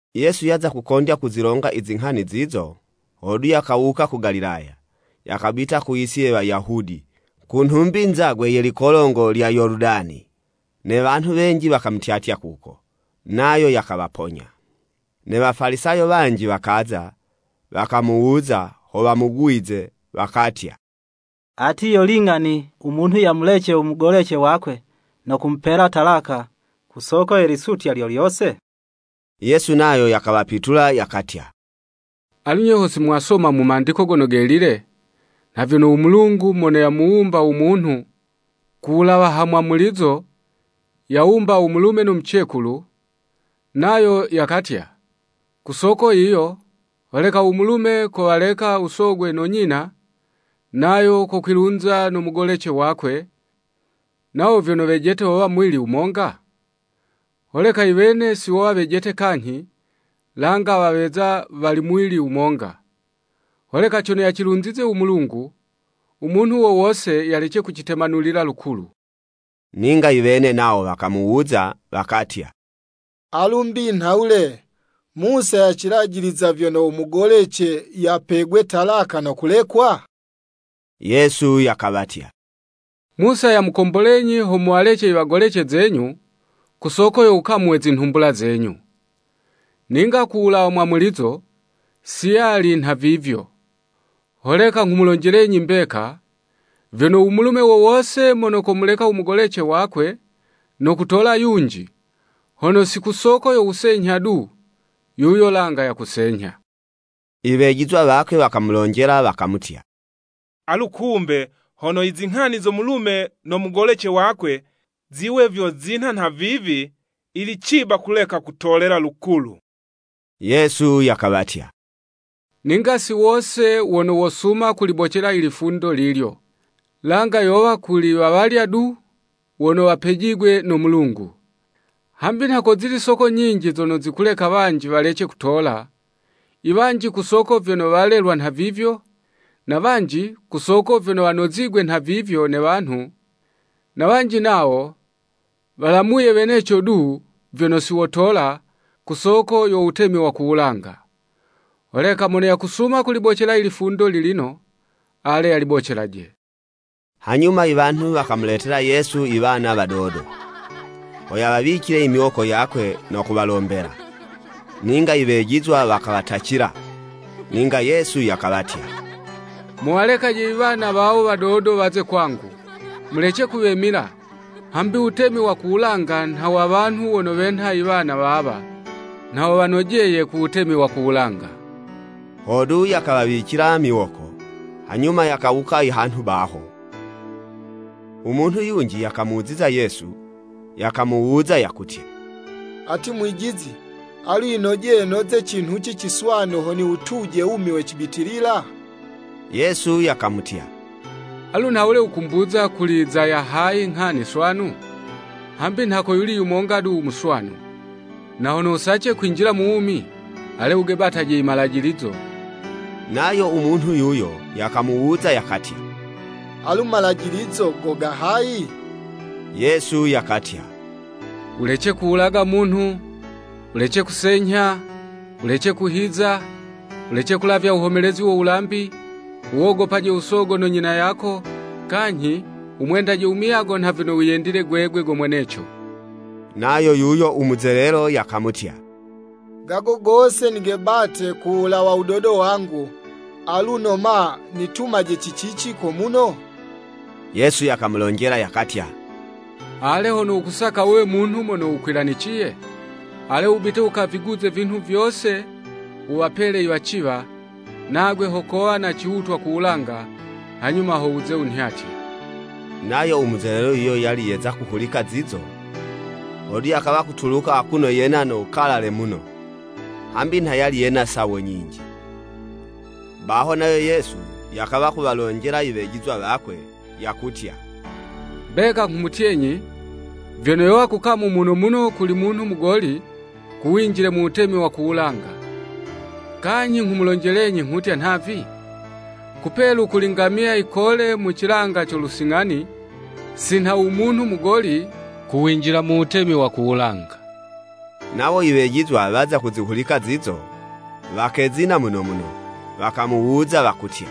Yesu yaza kukondya kuzilonga i zinghani zizo, hodu, yakawuka ku Galilaya, yakabita ku yisi ye Wayahudi, ku nhumbi nzagwe ye likolongo lya Yoludani. Ne wanhu wenji wakamutyatya kuko, nayo yakawaponya. Ne Wafalisayo wanji wakaza, wakamuwuza, ho wamugwize, wakatya, “Ati, yo ling'ani, u munhu yamulece u mugolece wakwe no kumupela talaka ku soko ye lisutya lyolyose?” Yesu nayo yakawapitula yakatya, “Alu, nye, ho simwasoma mu Mandiko Gono Gelile, nha vyono u Mulungu mono yamuwumba u munhu ku wulawa ha mwamulizo, yawumba, u mulume no mucekulu, nayo yakatya, ku soko yiyo holeka u mulume kowaleka u sogwe no nyina, nayo vyokwilunza no mugolece wakwe, nawo vyono wejete wowa muwili wumonga? Holeka iwene si wowa wejete kanyhi, langa waweza wali muwili wumonga. Holeka cono yacilunzize u Mulungu, u munhu wo wose yalece kucitemanulila lukulu.” Ninga iwene nawo wakamuwuza, wakatya, “Alu mbi nhawule, Musa yacilajiliza vyono u mugolece yapegwe talaka, no kulekwa?” Yesu yakawatya, “Musa yamukombolenyi ho muwalece iwagolece zenyu, ku soko yo wukamu we zinhumbula zenyu. Ninga ku wulawa mwamulizo, si yali nha vivyo. Holeka nghumulonjelenyi mbeka, vyono u mulume wo wose mono komuleka u mugolece wakwe no kutola yunji, hono si kusoko yo wusenyha du, yuyo langa yakusenyha.” I wejizwa wakwe wakamulonjela wakamutya, “Alu kumbe hono izinghani zo mulume no mugolece wakwe, ziwe vyo zinha nha vivi, yili ciba kuleka kutolela lukulu.” Yesu yakawatya, “Ninga si wose wono wosuma kulibocela i lifundo lilyo, langa yowa kuli wawalya du, wono wapejigwe no Mulungu. Hambi nha kozili soko nyinji zono zikuleka wanji walece kutola, iwanji ku soko vyono walelwa nhavivyo, na wanji, ku soko vyono wanozigwe nha vivyo ne wanhu, na wanji nawo, walamuye weneco du, vyono si wotola, ku soko yo wutemi wa ku wulanga. Holeka mono yakusuma kulibocela i lifundo lilino, ale yalibocelaje.” Hanyuma iwanhu wakamuletela Yesu iwana wadodo, ho yawawicile imiwoko yakwe no kuwalombela. Ninga iwejizwa wakawatacila. Ninga Yesu yakawatya, “Muwalekaje iwana wawo wadodo waze kwangu, mulece kuwemila, hambi u wutemi wa ku wulanga nha wa wanhu wono wenha iwana wawa, nha wo wanojeye ku wutemi wa ku wulanga.” Hodu, yakawawicila miwoko, hanyuma yakawuka ihanhu baho. U munhu yunji yakamuziza Yesu, yakamuwuza, yakutya, “Ati Mwijizi, alu yinojeye noze cinhuci ciswanu, ho niwutuje u wumi we cibitilila?” Yesu yakamutya, “Alu nhawule wukumbuza kuli za ya hayi nghani swanu? Hambi nha koyuli yumonga du u muswanu. Na hono wusace kwinjila mu wumi, ale wugebataje i malajilizo.” Nayo u munhu yuyo yakamuwuza yakatya, “Alu, malajilizo go ga hayi?” Yesu yakatya, “Wulece kuwulaga munhu, wulece kusenyha, wulece kuhiza, wulece kulavya wuhomelezi wo wulambi, wuwogopaje u sogo no nyina yako, kanyhi, wumwendaje u muyago nha vyono wiyendile gwegwe go mweneco.” Nayo yuyo u muzelelo, yakamutya, “Gago gose nigebate kuwulawa wudodo wangu, aluno ma, nitumaje ci cici komuno?” Yesu yakamulonjela yakatya, “Ale, hono wukusaka wuwe munhu mono wukwilaniciye, ale wubite wukaviguze ivinhu vyose, wuwapele iwaciwa, nagwe ho kowa na ciwutwa ku wulanga, hanyuma ho wuze wunhyatye.” Nayo u muzelelo yuyo yali yeza kuhulika zizo, hodu yakawa kutuluka akuno yena no wukalale muno, hambi nha yali yena sawo nyinji. Baho nayo Yesu, yakawa kuwalonjela i wejizwa wakwe yakutya, “Mbeka nghumutyenyi, vyono yowa kukamu muno muno kuli munhu mugoli, ku winjile mu wutemi wa ku wulanga. Kanyhi nghumulonjelenyi nghutya nhavi, kupelu kuli ngamiya yikole mu cilanga co lusing'ani, si nha u munhu mugoli, kuwinjila mu Wutemi wa ku wulanga.” Nawo i wejizwa waza kuzihulika zizo, wakezina muno muno, wakamuwuza, wakutya,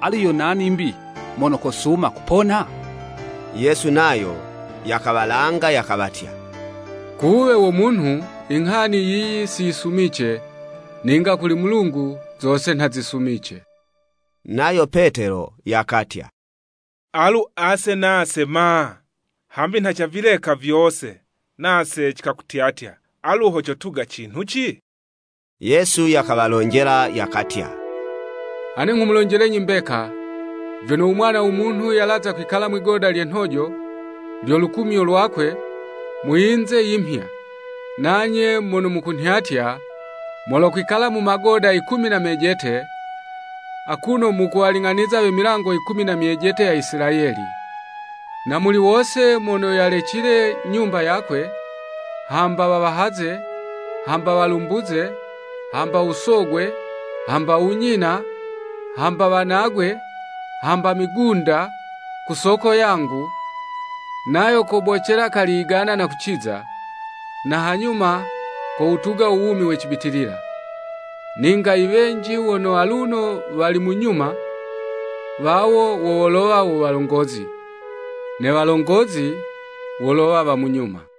“Alu yo nani mbi, mono kosuma kupona?” Yesu nayo, yakawalanga, yakawatya, “Ku wuwe wo munhu inghani yiyi, si yisumice, ninga kuli Mulungu zose nha zisumice.” Nayo Petelo yakatya, “Alu ase nase ma? Hambi nha cavileka vyose, nase cikakutyatya, alu ho cotuga cinhuci?” Yesu yakawalonjela, yakatya, “Ane nghumulonjelenyi mbeka, vyono u Mwana wo Munhu yalaza kwikala mwi'goda lye nhojo, lyo lukumyo lwakwe, mu yinze yimhya, nanye mono mukunhyatya, molokwikala mu magoda yikumi na mejete, akuno mukuwaling'aniza we milango yikumi na myejete ya Isilayeli. Na muli wose mono yalecile nyumba yakwe, hamba wawahaze, hamba walumbuze, hamba u sogwe, hamba u nyina, hamba wanagwe, hamba migunda ku soko yangu, nayo kobocela kali yigana na kuciza, na hanyuma kowutuga u wumi we cibitilila. Ninga i wenji wono aluno wali mu nyuma, wawo wo wolowa wo walongozi. Ne walongozi wolowa wa mu nyuma.”